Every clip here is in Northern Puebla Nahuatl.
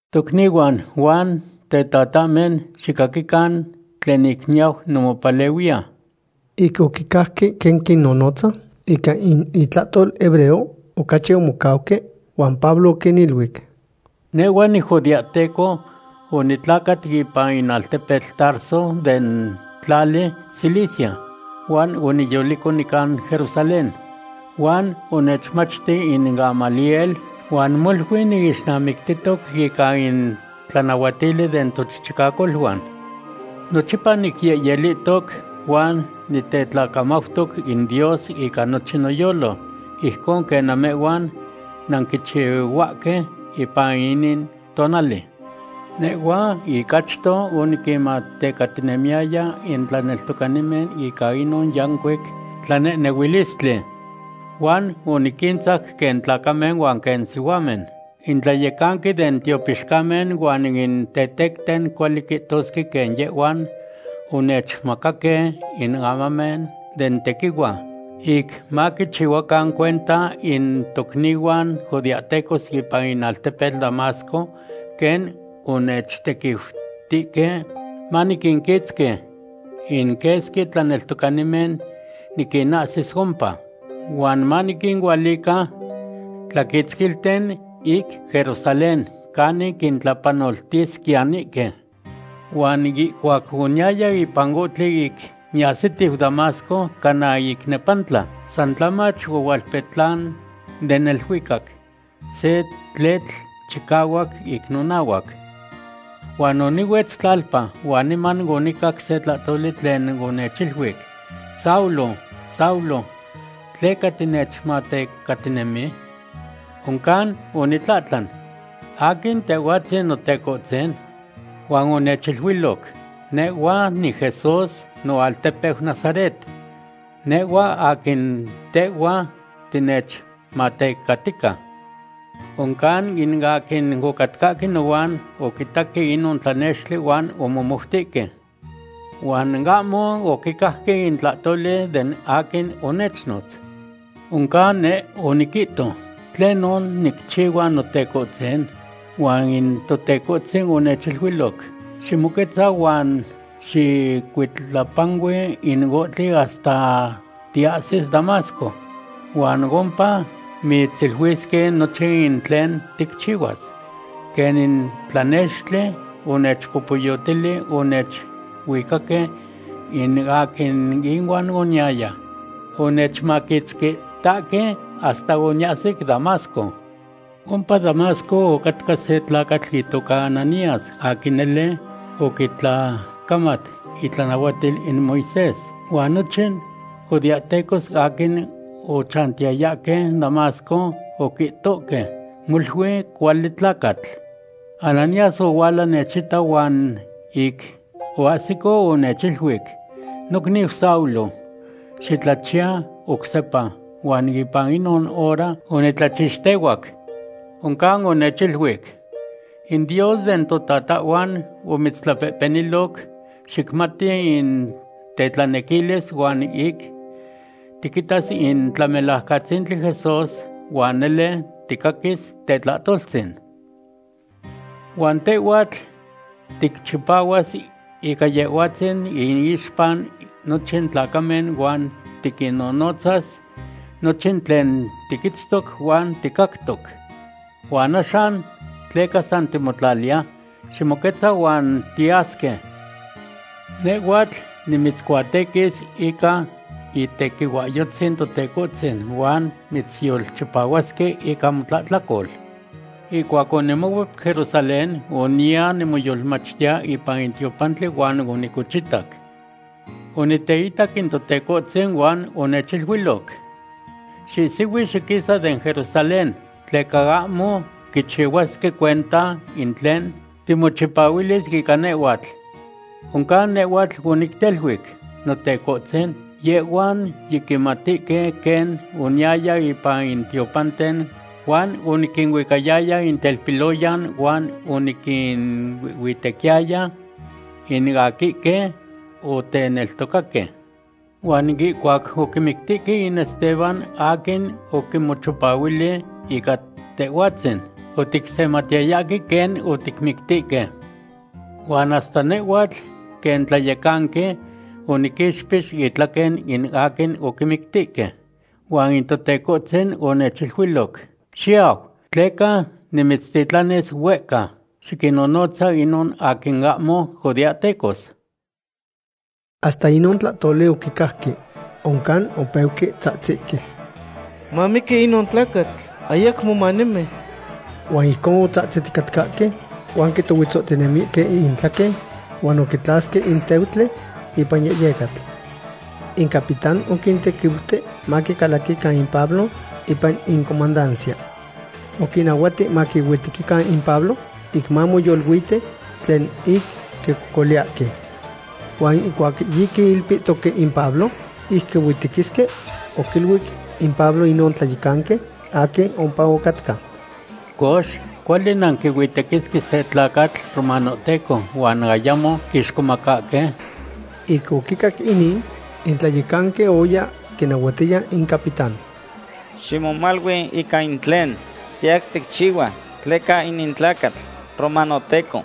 ―Tocnihuan huan tetahmen, xicaquican tlen ic niyau nimopalehuiya. Ic oquicajque quen quinnonotza ica in itlahtol hebreo, ocachi omocauque, huan Pablo oquiniluic: ―Nehhua nijudeahteco. Onitlacat ipan in altepetl Tarso den tlali Cilicia. Huan oniyolico nican Jerusalén, huan onechmachti in Gamaliel, huan molui niixnamictihtoc ica in tlanahuatili den tochichicacoluan. Nochipa nicyehyeltihtoc huan nitetlacamautoc in Dios ica nochin noyolo, ijcon quen namehhuan nanquichihuahque ipan inin tonali. Nehhua ic achto oniquinmatecatinemiyaya in tlaneltocanimen ica inon yancuic tlanehnehuilistli, huan oniquintzac quen tlacamen huan quen sihuamen. In tlayecanqui den tiopixcamen huan in tetecten cuali quihtosque quen yehhuan onechmacaque in amamen den tequihua ic maquichihuacan cuenta in tocnihuan judeahtecos ipan in altepetl Damasco quen onechtequiutihque maniquinquitzqui in quesqui tlaneltocanimen niquinahsis ompa, huan maniquinualica tlaquitzquilten ic Jerusalén canin quintlapanoltisquiyanihque. ’Huan ihcuac oniyaya ipan ohtli ic niyahsitiu Damasco cana ic nepantla, san tlamach ohualpetlan den neluicac se tletl chicahuac ic nonahuac. Huan onihuetz tlalpa huan niman onicac se tlahtoli tlen onechiluic: “Saulo, Saulo, ¿tleca tinechmatecatinemi?” Oncan onitlahtlan: “¿Aquin Tehhuatzin, Notecohtzin?” Huan onechiluiloc: “Nehhua niJesús noaltepeu Nazaret. Nehhua aquin tehhua tinechmatecatica.” Oncan in aquin ocatcahque nohuan oquitaque inon tlanextli huan omomoutihque, huan ahmo oquicajque in tlahtoli den aquin onechnotz. Oncan neh oniquihto: “¿Tlenon nicchihua, Notecohtzin?” Huan in Totecohtzin onechiluiloc: “Ximoquetza huan xicuitlapanui in ohtli hasta tiahsis Damasco. Huan ompa mitziluisque nochin in tlen ticchihuas.” Quen in tlanextli onechpopoyotili, onechuicaque in aquin inuan oniyaya. Onechmaquitzquihtahque hasta oniahsic Damasco. ’Ompa Damasco ocatca se tlacatl itoca Ananías, aquin nele oquitlacamat itlanahuatil in Moisés. Huan nochin judeahtecos aquin ochantiyayahque Damasco oquihtohque molui cuali tlacatl. Ananías ohuala nechita, huan ic oahsico, onechiluic: “Nocniu Saulo, xitlachiya oc sepa.” Huan ipan inon hora onitlachixtehuac. Oncan onechiluic: “In Dios den totatahhuan omitztlapehpeniloc xicmati in tetlanequilis huan ic tiquitas in Tlamelajcatzintli Jesús huan nele ticaquis tetlahtoltzin. Huan tehhuatl ticchipahuas ica Yehhuatzin iixpa nochin tlacamen huan tiquinnonotzas nochin tlen tiquitztoc huan ticactoc. ¿Huan axan tleca san timotlaliya? Ximoquetza huan tiyasque. Nehhuatl nimitzcuatequis ica itequihuahyotzin Totecohtzin huan mitzyolchipahuasque ica motlahtlacol.” ’Ihcuac onimocuep Jerusalén oniya nimoyolmachtiya ipan in tiopantli huan onicochitac. Oniteitac in Totecohtzin huan onechiluiloc: “Xihsihui xiquisa den Jerusalén, tleca ahmo quichihuasque cuenta in tlen timochipahuilis ica nehhuatl.” Oncan nehhuatl onicteluic: “Notecohtzin, yehhuan yiquimatihque quen oniyaya ipan in tiopanten huan oniquinuicayaya in telpiloyan huan oniquinuihhuitequiyaya in aquihque oteneltocaque. Huan ihcuac oquimictihque in Esteban aquin oquimochipahuili ica Tehhuatzin, oticsematiyayahque quen oticmictihque. Huan hasta nehhuatl quen tlayecanqui, oniquixpix intlaquen in aquin oquimictihque.” Huan in Totecohtzin onechiluiloc: “Xiyau, tleca nimitztitlanis huehca. Xiquinnonotzas inon aquin ahmo judeahtecos.” Hasta inon tlahtoli oquicajque. Oncan opejque tzahtizhque: ―¡Mamiqui inon tlacatl. Ayacmo manemi! Huan ijcon otzahtziticatcahque huan quitohuetzohtinemihque intlaquen huan oquitlasque in teutli ipan yehyecatl. In capitán oquintequiuti maquicalaquican in Pablo ipan in comandancia. Oquinnahuati maquihuitequican in Pablo ic mamoyoluiti tlen ic quicocoliyahque. Huan ihcuac yiquiilpihtoque in Pablo ic quihuitequisque, oquiluic in Pablo inon tlayecanqui aquin ompa ocatca: ―Cox, ¿cuali nanquihuitequisque se tlacatl romanohteco huan ayamo quixcomacahque? Ic oquicac inin, in tlayecanqui oya quinahuatiya in capitán: ―Ximomalui ica in tlen tiyau ticchihua, tleca inin tlacatl romanohteco.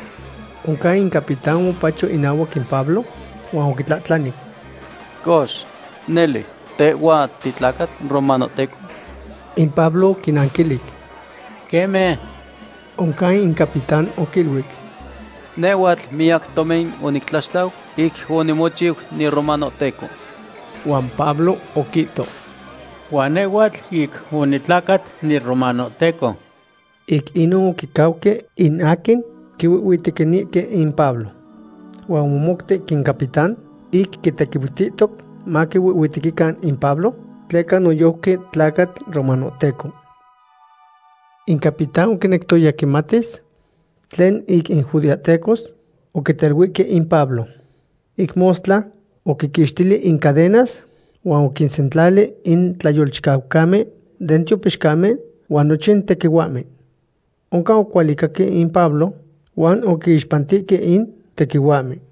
Oncan in capitán omopacho inahuac in Pablo huan oquitlahtlani: ―Cox, ¿nele, tehhua titlacatl romanohteco? In Pablo oquinanquilic: ―Queme. Oncan in capitán oquiluic: ―Nehhuatl miyac tomin onictlaxtlau ic onimochiu niromanohteco. Huan Pablo oquihto: ―Huan nehhuatl ic onitlacat niromanohteco. Ic inon oquicauque in aquin quihuihhuitequinihque in Pablo. Huan omomoutic in capitán ic quitequiutihtoc maquihuihhuitequican in Pablo tleca noyojqui tlacatl romanohteco. In capitán oquinectoya quimatis tlen ic in judeahtecos oquiteluihque in Pablo. Ic mostla oquiquixtili in cadenas huan oquinsentlali in tlayecancamen den tiopixcamen huan nochin tequihuahmen. Oncan oquihualicaque In Pablo huan oquiixpantihque in tequihuahmen.